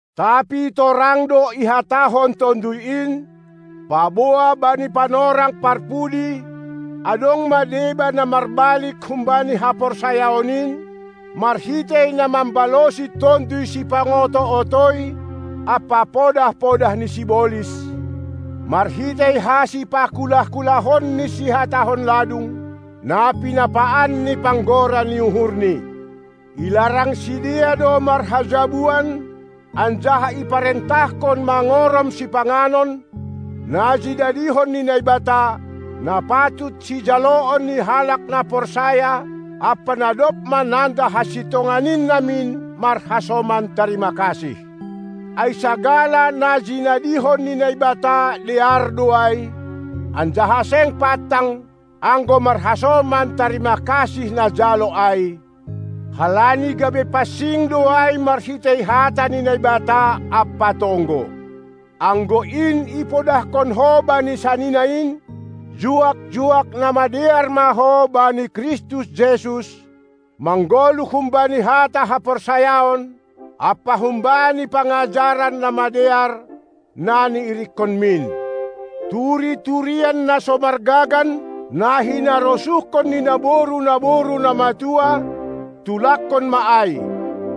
Tapi torang do ihatahon Tonduy in, paboa bani panorang parpudi adong ma deba na marbalik humbani haporsayaon in, marhitei na mambalosi tonduy sipangoto-otoi ampa podah-podah ni sibolis, marhitei hasipakulah-kulahon ni sihatahon ladung, na pinapaan ni panggora ni uhurni: Ilarang sidea do marhajabuan anjaha iparentahkon mangorom sipanganon, na jinadihon ni Naibata, na patut sijaloon ni halak na porsaya ampa na dob mananda hasintongan in namin marhasoman tarima kasih. Ai sagala na jinadihon ni Naibata dear do ai, anjaha seng pantang, anggo marhasoman tarima kasih najalo ai, halani gabe pansing do ai marhitei hata ni Naibata ampa tonggo. Anggo in ipodahkon ho bani sanina in, juak-juak na madear ma ho bani Kristus Jesus, manggoluh humbani hata haporsayaon ampa humbani pangajaran na madear, na niirikkonmin. Turi-turian na so margagan, na hinarosuhkon ni naboru-naboru na matua, tulakkon ma ai.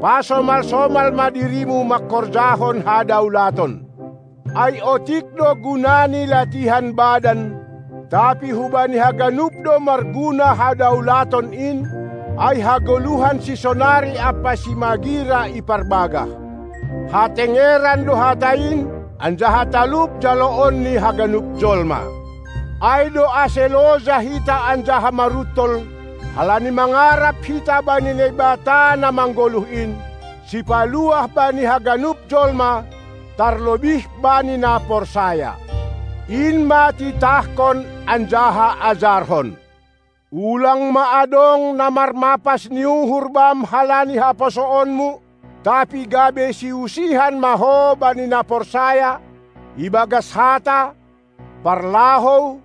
Pasomal-somal ma dirimu mangkorjahon hadaulaton. Ai otik do guna ni latihan badan, tapi hubani haganup do marguna hadaulaton in, ai hagoluhan sisonari ampa simagira iparbagah. Hatengeran do hata in, anjaha talup jaloon ni haganup jolma. Ai do ase loja hita anjaha maruntol, halani mangarap hita bani Naibata na manggoluh in, Sipaluah bani haganup jolma, tarlobih bani na porsaya. In ma titahkon anjaha ajarhon! Ulang ma adong na marmapas ni uhur bam halani haposoonmu, tapi gabe siusihan ma ho bani na porsaya, ibagas hata, parlahou,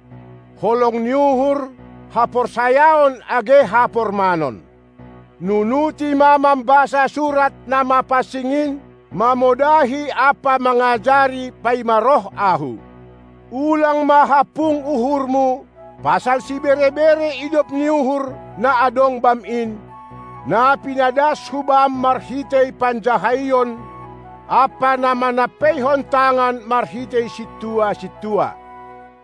holong ni uhur, haporsayaon age hapormanon. Nunuti ma mambasa surat na mapansing in, mamodahi ampa mangajari paima roh ahu. Ulang ma hampung uhurmu pasal sibere-bere idop ni uhur na adong bam in, na pinadas hu bam marhitei panjahaion ampa na manampeihon tangan marhitei sintua-sintua.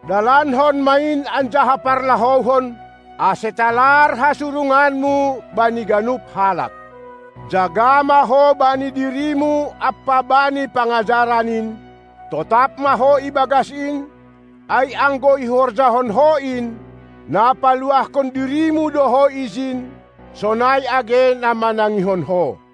Dalankon ma in anjaha parlahouhon, ase talar hasurunganmu bani ganup halak. Jaga ma ho bani dirimu ampa bani pangajaran in; totap ma ho ibagas in, ai anggo ihorjahon ho in, na paluahkon dirimu do ho ijin sonai age na manangihon ho.